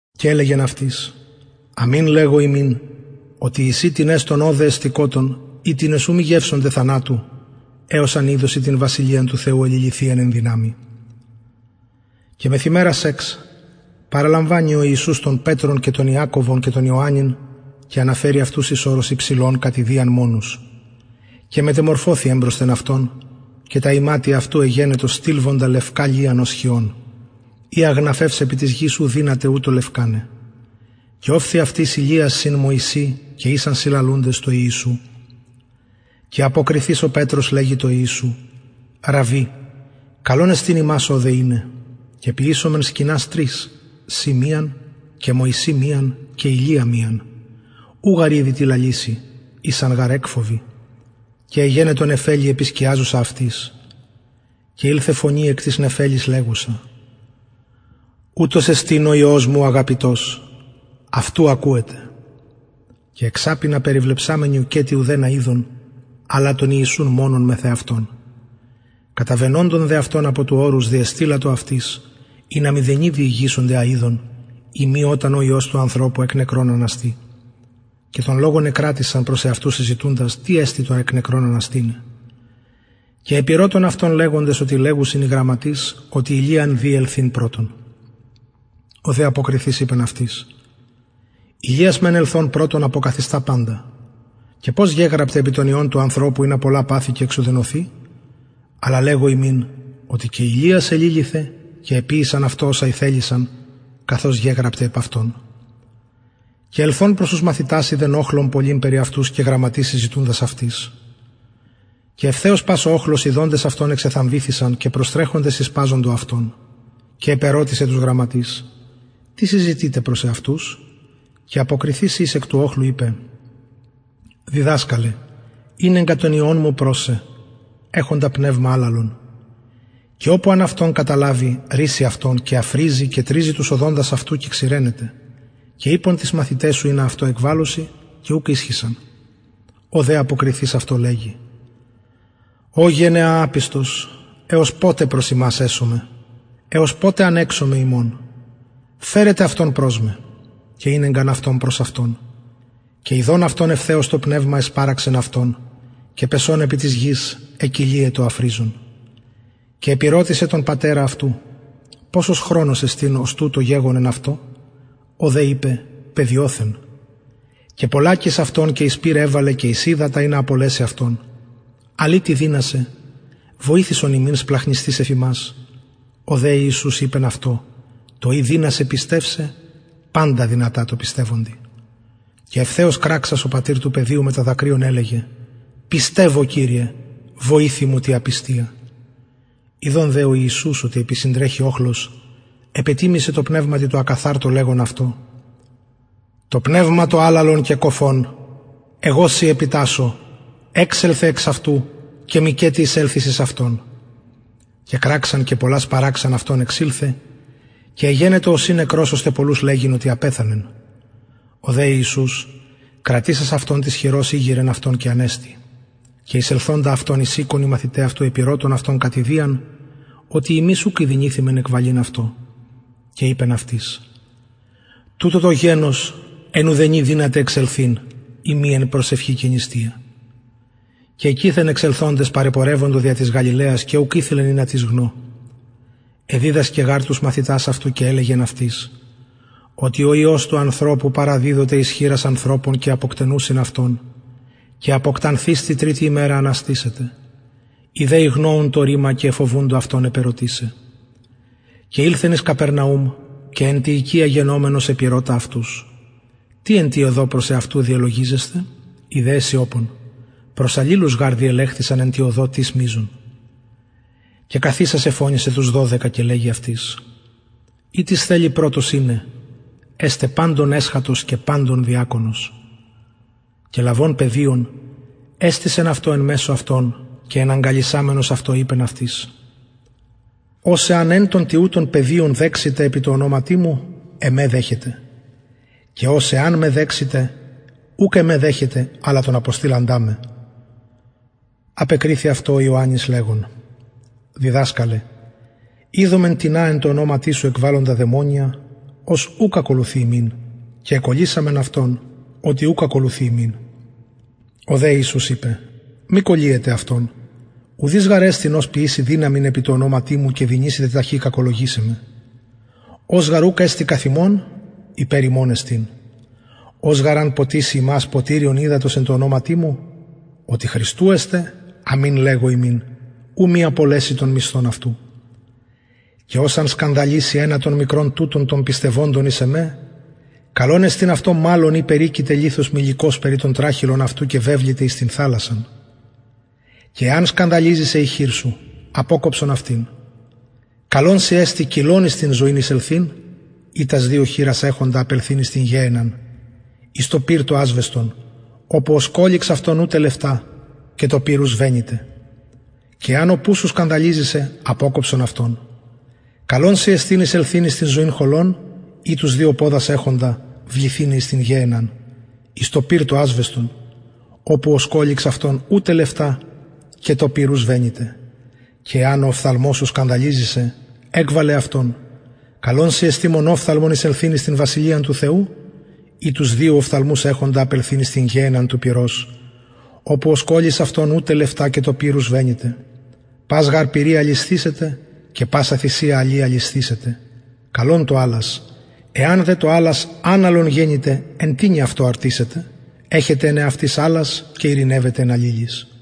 και ελεγεν αυτοις αμην λεγω υμιν οτι εισιν τινες των ωδε εστηκοτων οιτινες ου μη γευσωνται θανατου εως αν ιδωσιν την βασιλειαν του θεου εληλυθυιαν εν δυναμει και μεθ ημερας εξ παραλαμβανει ο ιησους τον πετρον και τον ιακωβον και ιωαννην και αναφερει αυτους εις ορος υψηλον κατ ιδιαν μονους και μετεμορφωθη εμπροσθεν αυτων και τα ιματια αυτου εγενοντο στιλβοντα λευκα λιαν ως χιων οια γναφευς επι της γης ου δυναται λευκαναι και ωφθη αυτοις ηλιας συν μωση και ησαν συλλαλουντες τω ιησου και αποκριθεις ο πετρος λεγει τω ιησου ραββι καλον εστιν ημας ωδε ειναι και ποιησωμεν σκηνας τρεις σοι μιαν και μωση μιαν και ηλια μιαν ου γαρ ηδει τι λαλησει ησαν γαρ εκφοβοι και εγενετο νεφελη επισκιαζουσα αυτοις και ηλθεν φωνη εκ της νεφελης ουτος εστιν ο υιος μου ο αγαπητος αυτου ακουετε και εξαπινα περιβλεψαμενοι ουκετι ουδενα ειδον αλλα τον ιησουν μονον μεθ εαυτων καταβαινοντων δε αυτων απο του ορους διεστειλατο αυτοις ινα μηδενι διηγησωνται α ειδον ει μη οταν ο υιος του ανθρωπου εκ νεκρων αναστη και τον λογον εκρατησαν προς εαυτους συζητουντες τι εστιν το εκ νεκρων αναστηναι και επηρωτων αυτον λεγοντες οτι λεγουσιν οι γραμματεις οτι ηλιαν δει ελθειν πρωτον ο δε αποκριθεις ειπεν αυτοις ηλιας μεν ελθων πρωτον αποκαθιστα παντα και πως γεγραπται επι τον υιον του ανθρωπου ινα πολλα παθη και εξουδενωθη αλλα λεγω υμιν οτι και ηλιας εληλυθεν και εποιησαν αυτω οσα ηθελησαν καθως γεγραπται επ αυτον και ελθων προς τους μαθητας ειδεν οχλον πολυν περι αυτους και γραμματεις συζητουντας αυτοις και ευθεως πας ο οχλος ιδων αυτον εξεθαμβηθη και προστρεχοντες ησπαζοντο αυτον και επηρωτησεν τους γραμματεις τι συζητειτε προς αυτους και αποκριθεις εις εκ του οχλου ειπεν διδασκαλε ηνεγκα τον υιον μου προς σε εχοντα πνευμα αλαλον και οπου αν αυτον καταλαβη ρησσει αυτον και αφριζει και τριζει τους οδοντας αυτου και ξηραινεται και ειπον τοις μαθηταις σου ινα αυτο εκβαλωσιν και ουκ ισχυσαν ο δε αποκριθεις αυτω λεγει ω γενεα απιστος εως ποτε προς υμας εσομαι εως ποτε ανεξομαι υμων φερετε αυτον προς με και ηνεγκαν αυτον προς αυτον και ιδων αυτον ευθεως το πνευμα εσπαραξεν αυτον και πεσων επι της γης εκυλιετο αφριζων και επηρωτησεν τον πατερα αυτου ποσος χρονος εστιν ως τουτο γεγονεν αυτω ο δε ειπεν παιδιοθεν και πολλακις αυτον και εις το πυρ εβαλεν και εις υδατα ινα απολεση αυτον αλλ ει τι δυνασαι βοηθησον ημιν σπλαγχνισθεις εφ ημας ο δε ιησους ειπεν αυτω το ει δυνασαι πιστευσαι παντα δυνατα τω πιστευοντι και ευθεως κραξας ο πατηρ του παιδιου μετα δακρυων ελεγεν πιστευω κυριε βοηθει μου τη απιστια ιδων δε ο ιησους οτι επισυντρεχει οχλος επετιμησεν τω πνευματι τω ακαθαρτω λεγων αυτω το πνευμα το αλαλον και κωφον εγω σοι επιτασσω εξελθε εξ αυτου και μηκετι εισελθης εις αυτον και κραξαν και πολλα σπαραξαν αυτον εξηλθεν και εγενετο ωσει νεκρος ωστε πολλους λεγειν οτι απεθανεν ο δε ιησους κρατησας αυτον της χειρος ηγειρεν αυτον και ανεστη και εισελθοντα αυτον εις οικον οι μαθηται αυτου επηρωτων αυτον κατ ιδιαν οτι ημεις ουκ ηδυνηθημεν εκβαλειν αυτο και ειπεν αυτοις τουτο το γενος εν ουδενι δυναται εξελθειν ει μη εν προσευχη και νηστεια και εκειθεν εξελθοντες παρεπορευοντο δια της γαλιλαιας και ουκ ηθελεν ινα τις γνω εδιδασκεν γαρ τους μαθητας αυτου και ελεγεν αυτοις οτι ο υιος του ανθρωπου παραδιδοται εις χειρας ανθρωπων και αποκτενουσιν αυτον και αποκτανθεις τη τριτη ημερα αναστησεται οι δε ηγνοουν το ρημα και εφοβουντο αυτον επερωτησαι και ηλθεν εις καπερναουμ και εν τη οικια γενομενος επηρωτα αυτους τι εν τη οδω προς εαυτους διελογιζεσθε οι δε εσιωπων προς αλληλους γαρ διελεχθησαν εν τη οδω τις μειζων και καθισας εφωνησεν τους δωδεκα και λεγει αυτοις ει τις θελει πρωτος ειναι εσται παντων εσχατος και παντων διακονος και λαβων παιδιον εστησεν αυτο εν μεσω αυτων και εναγκαλισαμενος αυτο ειπεν αυτοις ος εαν εν των τοιουτων παιδιων δεξηται επι τω ονοματι μου εμε δεχεται και ος εαν εμε δεξηται ουκ εμε δεχεται αλλα τον αποστειλαντα με απεκριθη δε αυτω ιωαννης λεγων διδασκαλε ειδομεν τινα τω ονοματι σου εκβαλλοντα δαιμονια ος ουκ ακολουθει ημιν και εκωλυσαμεν αυτον οτι ουκ ακολουθει ημιν ο δε ιησους ειπεν μη κωλυετε αυτον ουδεις γαρ εστιν ος ποιησει δυναμιν επι τω ονοματι μου και δυνησεται ταχυ κακολογησαι με ος γαρ ουκ εστιν καθ υμων υπερ υμων εστιν ος γαρ αν ποτιση υμας ποτηριον υδατος εν ονοματι μου οτι χριστου εστε αμην λεγω υμιν ου μη απολεση τον μισθον αυτου και ος εαν σκανδαλιση ενα των μικρων των πιστευοντων εις εμε καλον εστιν αυτω μαλλον ει περικειται λιθος μυλικος περι τον τραχηλον αυτου και βεβληται εις την θαλασσαν και εαν σκανδαλιζη σε η χειρ σου αποκοψον αυτην καλον σοι εστιν κυλλον εις την ζωην εισελθειν η τας δυο χειρας εχοντα απελθειν εις την γεενναν εις το πυρ το ασβεστον οπου ο σκωληξ αυτων ου τελευτα και το πυρ ου σβεννυται και εαν ο πους σου σκανδαλιζη σε αποκοψον αυτον καλον εστιν σοι εισελθειν εις την ζωην χωλον η τους δυο ποδας εχοντα βληθηναι εις την γεενναν εις το πυρ το ασβεστον οπου ο σκωληξ αυτων ου τελευτα και το πυρ ου σβεννυται και εαν ο οφθαλμος σου σκανδαλιζη σε εκβαλε αυτον καλον σοι εστιν μονοφθαλμον εισελθειν εις την βασιλειαν του θεου η δυο οφθαλμους εχοντα βληθηναι εις την γεενναν του πυρος οπου ο σκωληξ αυτων ου τελευτα και το πυρ ου σβεννυται πας γαρ πυρι αλισθησεται και πασα θυσια αλι αλισθησεται καλον το αλας εαν δε το αλας αναλον γενηται εν τινι αυτο αρτυσετε εχετε εν εαυτοις αλας και ειρηνευετε εν αλληλοις